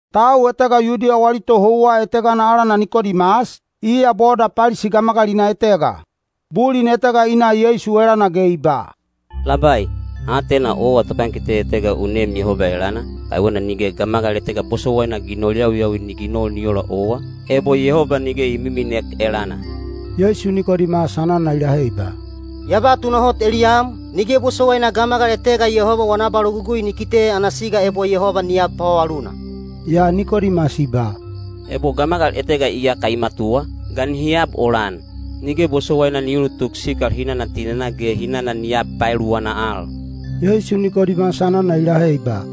Tau etega Yudiya wali tohouwa etegana alana Nikodimas, iya boda Palisi gamagalina etega. Bulin etega i na Yeisu elana ge i ba, “Labai, ha atena owa topankite etega u neem Yehoba elana, kaiwena nige gamagal etega bosowaina ginol yawiyawi ni ginol ni ola owa, ebo Yehoba nige i miminek elana.” Yeisu Nikodimas anana i lahe i ba, “Ya ba tunahot eliyam, nige bosowaina gamagal etega Yehoba wana abalogugui ni kite ana siga ebo Yehoba ni ab pavavaluna.” Yaa Nikodimas i ba, “Ebo gamagal etega iyaka i matuwa, ga nihi ab ola-an? Nige bosowaina ni ulutuk sikal hinana tinenaa ge hinana ni ab paeluwana al.” Yeisu Nikodimas anana i lahe i ba,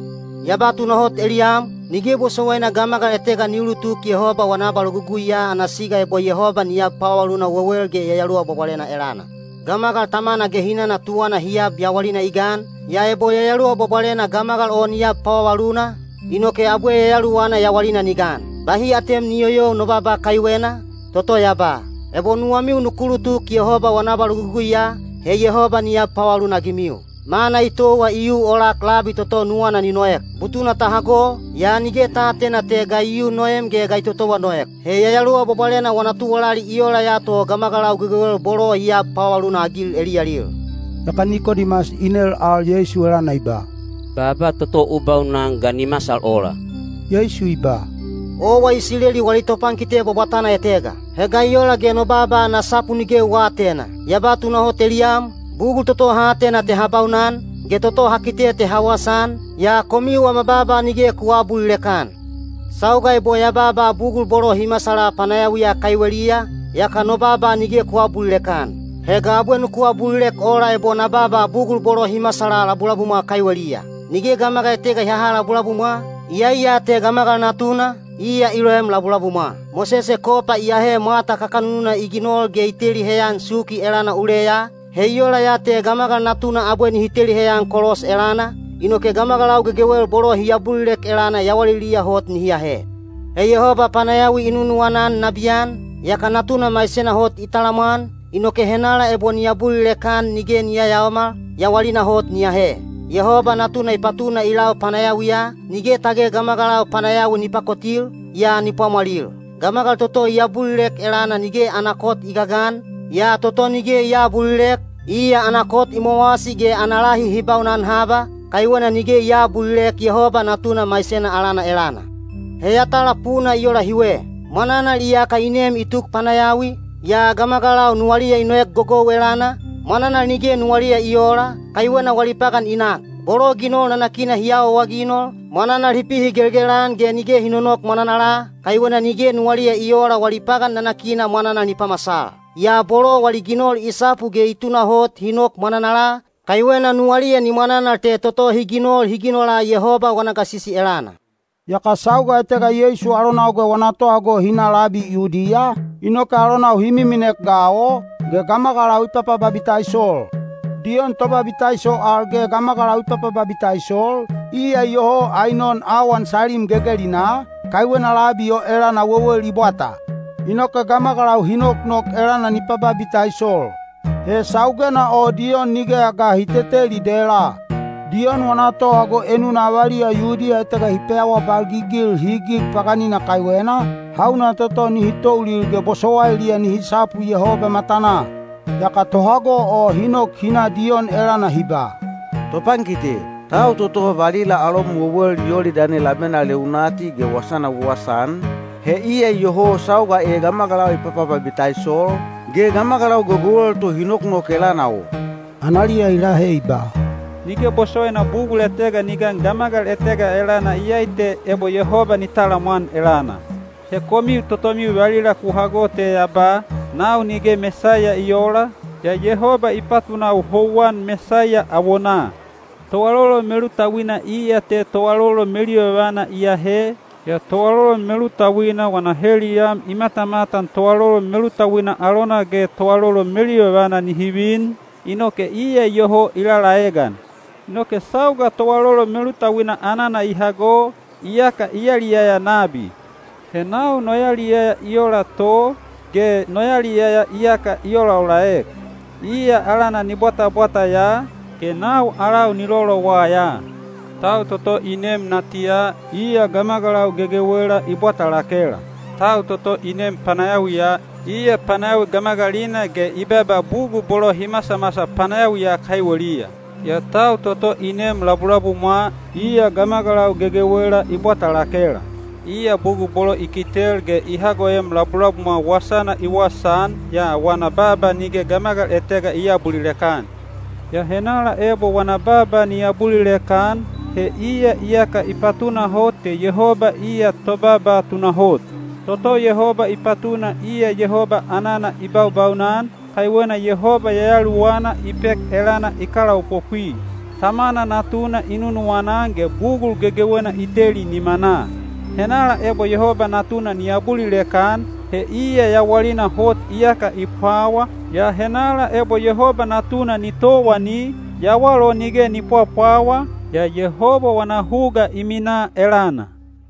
“Ya ba tunahot eliyam, nige bosowaina gamagal etega ni ulutuk Yehoba wana abaloguguiya ana siga ebo Yehoba ni ab pavavaluna wewel ge Yayaluwa Bwabwalena elana. Gamagal tamana ge hinana tuwana hi ab yawalina i gan, yaa ebo Yayaluwa Bwabwalena gamagal o ni ab pavavaluna, inoke abwe yayaluwana yawalina ni gan. Bahi atem ni yoyou no baaba kaiwena, toto ya ba, ‘Ebo nuwamiu nuku ulutuk Yehoba wana abaloguguiya, he Yehoba ni ab pavavaluna-agimiu.’ Mana i towa i yu olak labi toto nuwana ni noek. Butuna ta hago, yaa nige ta aatena te ga i yu noem ge ga i totowa noek. He Yayaluwa Bwabwalena wana tuwalali i ola ya to gamagalau gegewel bolo i ab pavavaluna-agil eliyalil.” Yaka Nikodimas i nel al Yeisu elana i ba, “Baaba toto u baunan ga ni masal ola?” Yeisu i ba, “Owa Isileli wali topankite bwabwatana etega. He ga i ola ge no baaba ana sapu nige u aatena? Ya ba tunahot eliyam, bugul toto ha atena te ha baunan, ge toto ha kite te ha wasaan, yaa komiu wama baaba nige ku aabulilek-an. Sauga ebo ya baaba bugul bolo hi masala panayawiya kaiweliya, yaka no baaba nige ku aabulilek-an. He ga abwe nuku abulilek ola ebo na baaba bugul bolo hi masala labulabumwa kaiweliya? Nige gamagal etega i haha labulabumwa, iyai ya te Gamagal Natuna, iya i loem labulabumwa. Mosese kopa i ahe mwata kakanununa i ginol ge i teli heyan suki elana uleya, he i ola ya te Gamagal Natuna abwe nihi teli heyan kolos elana, inoke gamagalau gegewel bolo hi abulilek elana yawaliliya hot nihi ahe.” He Yehoba panayawi i nunuwana-an nabiyan, yaka Natuna maisena hot i talamwan, inoke henala ebo ni abulilek-an nige ni yayaomal, yawalina hot ni ahe. Yehoba Natuna i patuna i lau panayawiya, nige tage gamagalau panayawi ni pakotil, yaa ni pwamwalil. Gamagal toto i abulilek elana nige ana kot i gagan, yaa toto nige i aabulilek, iya ana kot i mowasi ge ana lahi hi baunan haba, kaiwena nige i aabulilek Yehoba Natuna maisena alana elana. He yatala puna i ola hiwe: mwananal iyaka i nem i tuk panayawi, yaa gamagalau nuwaliya i noek gogou elana, mwananal nige nuwaliya i oola, kaiwena wali pagan i nak. Bolo ginol nanakina hi awaawaginol, mwananal hi pihigelgel-an ge nige hi nonok mwananala, kaiwena nige nuwaliya i oola wali pagan nanakina mwananal ni pamasal. Yaa bolo wali ginol i sapu ge i tunahot hi nok mwananala, kaiwena nuwaliya ni mwananal te toto hi ginol hi ginola Yehoba wana gasisi elana. Yaka sauga etega Yeisu alonau ge wana tohago hi na labi Yudiya, inoke alonau hi miminek ga o, ge gamagalau i papababitaisol. Diyon Tobabitaiso al ge gamagalau i papababitaisol, iya iyoho Ainon awan Salim gegelinaa, kaiwena labi o elana wewel i bwata. Inoke gamagalau hi noknok elana ni pababitaisol. He saugena o Diyon nigeya ga hi teteli dela. Diyon wana tohago enuna avaliya Yudiya etega hi peawabalgigil highig paganina kaiwena, hauna toto nihi toulil ge bosowailiya nihi sapu Yehoba matanaa. Yaka tohago o hi nok hi na Diyon elana hi ba, “Topankite, tau toto valila alom wewel Yolidani labena leunati ge wasana u wasaan, he iya iyoho sauga e gamagalau i papababitaisol, ge gamagalau gegewel to hi noknok elana o.” Analiya i lahe i ba, “Nige bosowaina bugul etega ni gan gamagal etega elana iyai te ebo Yehoba ni talamwan elana. He komiu totomiu valila ku hago ya te ya ba, ‘Nau nige Mesaiya i oola, yaa Yehoba i patunau houwan Mesaiya awonaa.’ Toalolon melutauina iya te toalolon meluyovana i aahe, yaa toalolon melutauina wana heliyam i matamatan toalolon melutauina alona ge toalolon meluyovana nihi vin, inoke iya iyoho i lalaegan. Inoke sauga toalolon melutauina anana i hago, yaka i yaliyaya nabi. He nau no yaliyaya i ola to, ge no yaliyaya iyaka i olaolaek. Iya alana ni bwatabwata ya, ge nau alau ni lolowa ya.” Tau toto i neem natiya, iya gamagalau gegewela i bwata lakela. Tau toto i neem panayawiya, iya panayawi gamagalina ge i baaba bugul bolo hi masamasal panayawiya kaiweliya. Yaa tau toto i neem labulabumwa, iya gamagalau gegewela i bwata lakela. Iya bugul bolo i kitel ge i hagoem labulabumwa wasana i wasaan, yaa wana baaba nige gamagal etega i aabulilek-an. Yaa henala ebo wana baaba ni abulilek-an, he iya iyaka i patunahot te Yehoba iya tobaaba tunahot. Toto Yehoba i patuna iya Yehoba anana i baubaunan, kaiwena Yehoba Yayaluwana i pek elana i kalaopopwi. Tamana Natuna i nunuwana-an ge bugul gegewena i teli nimanaa. Henala ebo Yehoba Natuna ni abulilek-an, he iya yawalina hot iyaka i pwawa, yaa henala ebo Yehoba Natuna ni towani, yawal o nige ni pwapwawa, yaa Yehoba wana huga i minaa elana.